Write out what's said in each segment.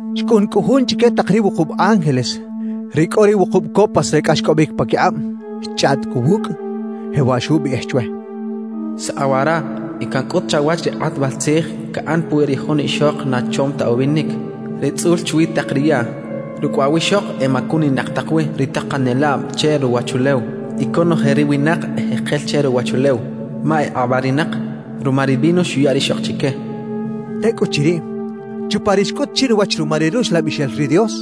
Xcꞌun cꞌu jun chique tak ri wukub ángeles, ri cꞌo ri wukub copas re cꞌaxcꞌobic paquikꞌab. Xchꞌaꞌt cꞌu wucꞌ, jewaꞌ xubiꞌij chwe: «Saꞌa wara y cancꞌut chawach ri kꞌatbal tzij caꞌan puwi ri jun ixok na chom ta ubinic, ri tzꞌul chwi tak ri yaꞌ. Rucꞌ waꞌ wiꞌxok emacuninak tak wi ri takanelab che ruwachulew y conoje ri winak ejekel che ruwachulew, ma ekꞌabarinak ruma ri vino xuya rixok chique» xchaꞌ. Tecꞌuchiriꞌ, chupa ri xcꞌut chinuwach ruma ri Ruxlabixel ri Dios,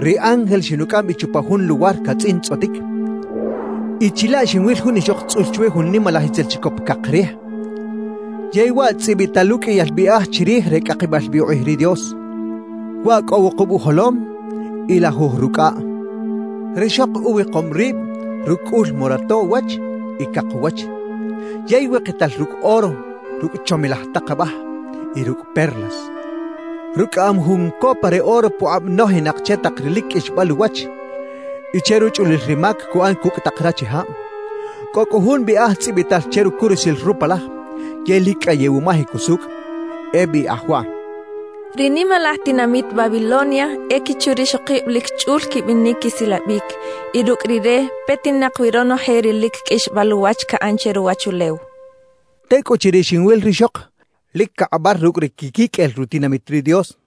ri ángel xinucꞌam bi chupa jun luwar catzꞌintzꞌotic y chilaꞌ xinwil jun ixok tzꞌul chwi jun nimalaj itzel chicop cak rij, yey waꞌ tzꞌibital uqꞌuiyal biꞌaj chirij re cꞌakibal bi ukꞌij ri Dios. Waꞌ cꞌo wukub ujolom y lajuj rucꞌaꞌ. Rixok uwikom rib rucꞌ cꞌul morato uwach y cak uwach; yey wikital rucꞌ oro, rucꞌ chomilaj tak abaj y rucꞌ perlas. Rucꞌaꞌam jun copa re oro pukꞌab nojinak che tak ri lic qꞌuixbal uwach y che ruchꞌulil ri mac cuꞌan cucꞌ tak rachijab. Cꞌo cꞌu jun biꞌaj tzꞌibital che rucurusil rupalaj yey lic cꞌayew umajic usucꞌ; e biꞌaj waꞌ: Ri nimalaj tinamit Babilonia e quichu rixokib lic chꞌul quibinic quisilabic, y rucꞌ rire petinak wi ronoje ri lic qꞌuixbal uwach caꞌan che ruwachulew. Tecꞌuchiriꞌ xinwil rixok lic cakꞌabar rucꞌ ri quiquiqꞌuel rutinamit ri Dios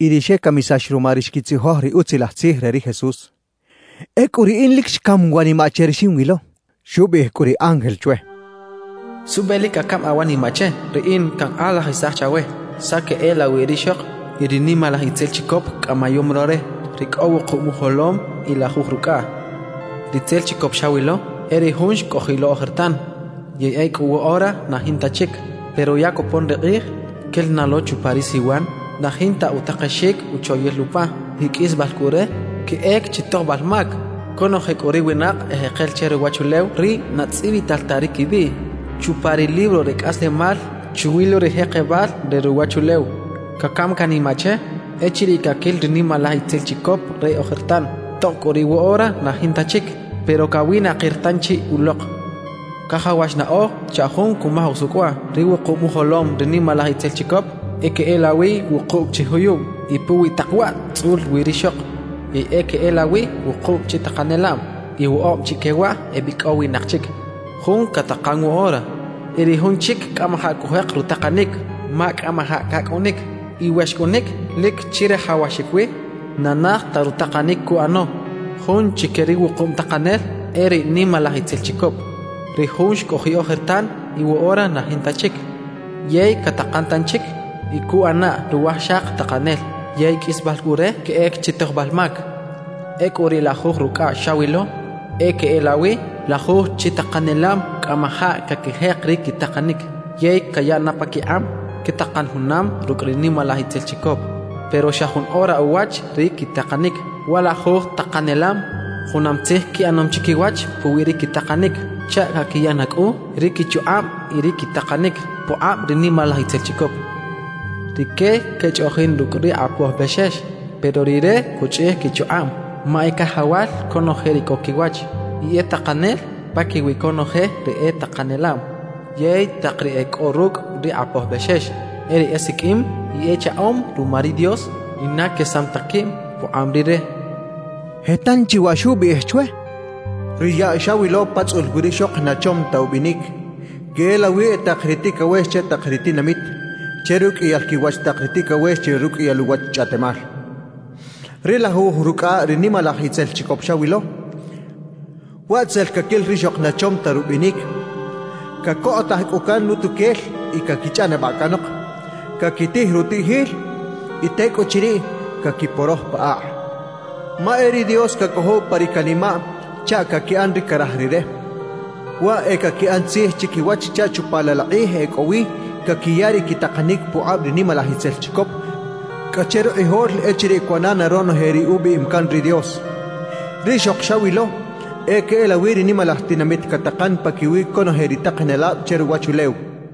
y ri xecamisax ruma ri xquitzijoj ri Utzilaj Tzij re ri Jesús. Ecꞌu riꞌin lic xcam wanimaꞌ che ri xinwilo. Xubiꞌij cꞌu ri ángel chwe: «¿Suꞌbe lic cacam awanimaꞌ che? Riꞌin cankꞌalajisaj chawe saꞌ queꞌelawi rixok y ri nimalaj itzel chicop cꞌamayom lo re, ri cꞌo wukub ujolom y lajuj rucꞌaꞌ. Ritzel chicop xawilo e ri jun xcꞌojiꞌ lo ojertan yey ecꞌu woꞌora na jinta chic. Pero ya copon ri kꞌij quel na lo chupa ri siwan na jinta utakexic uchoyil upa, y qꞌuisbal cꞌu re, queꞌec chi tojbal mac. Conoje cꞌu ri winak ejekel che ruwachulew, ri na tzꞌibital ta ri quibiꞌ chupa ri libro re cꞌaslemal chwi lo ri jekebal re ruwachulew, cacam canimaꞌ che echiriꞌ caquil ri nimalaj itzel chicop re ojertan. Tob cꞌu riꞌ woꞌora na jinta chic, pero cawinakir tanchi ulok. »Cajawax naꞌoj chaꞌ jun cumaj usucꞌ waꞌ: Ri wukub ujolom ri nimalaj itzel chicop e queꞌelawi wukub chi juyub y puwi tak waꞌ tzꞌul wi rixok; yey e queꞌelawi wukub chi takanelab. Y woꞌob chique waꞌ ebicꞌowinak chic; jun catakan woꞌora y ri jun chic cꞌamajaꞌ cujek rutakanic ma cꞌamajaꞌ cacꞌunic. Y we xcꞌunic, lic chirajawaxic wi na naj ta rutakanic cuꞌano. Jun chique ri wukub takanel e ri nimalaj itzel chicop, ri jun xcꞌojiꞌ ojertan y woꞌora na jinta chic, yey catakan tanchic y cuꞌana ruwajxak takanel. Yey qꞌuisbal cꞌu re, queꞌec chi tojbal mac. »Ecꞌu ri lajuj rucꞌaꞌ xawilo, e queꞌelawi lajuj chi takanelab cꞌamajaꞌ caquijek ri quitakanic; yey cayaꞌ na paquikꞌab quetakan junam rucꞌ ri nimalaj itzel chicop, pero xa jun ora uwach ri quitakanic. Wa lajuj takanelab junam tzij quiꞌanom chiquiwach puwi ri quitakanic chaꞌ caquiya na cꞌu ri quichukꞌab y ri quitakanic pukꞌab ri nimalaj itzel chicop. Rique quechꞌoꞌjin rucꞌ ri Kꞌapoj Bexex, pero Rire cuchꞌij quichukꞌab, ma e Cajawal conoje ri cꞌo quiwach y e Takanel paquiwi conoje ri e takanelab. Yey tak ri e cꞌo rucꞌ ri Kꞌapoj Bexex, e ri esiqꞌuim y echaꞌom ruma ri Dios y na quesam ta quib pukꞌab Rire» xchaꞌ. Je tanchi waꞌ xubiꞌij chwe: «Ri yaꞌ xawilo pa tzꞌul wi rixok na chom ta ubinic, queꞌelawi e tak ri ticawex che tak ri tinamit, che ruqꞌuiyal quiwach tak ri ticawex che ruqꞌuiyal uwach chꞌaꞌtemal. Ri lajuj rucꞌaꞌ ri nimalaj itzel chicop xawilo, waꞌ tzel caquil rixok na chom ta rubinic; cacokꞌotaj cꞌu can utuquel y caquichꞌanabaꞌ canok, caquitij rutiꞌjil y tecꞌuchiriꞌ caquiporoj pa akꞌ. Ma e ri Dios cacojow pa ri canimaꞌ chaꞌ caquiꞌan ri caraj Rire, waꞌ e caquiꞌan tzij chiquiwach chaꞌ chupa laꞌ la kꞌij ecꞌowi caquiya ri quitakanic pukꞌab ri nimalaj itzel chicop cꞌa che rukꞌijol echiriꞌ cuꞌana na ronoje ri ubiꞌim can ri Dios. Rixok xawilo e queꞌelawi ri nimalaj tinamit catakan paquiwi conoje ri takanelab che ruwachulew» xchaꞌ.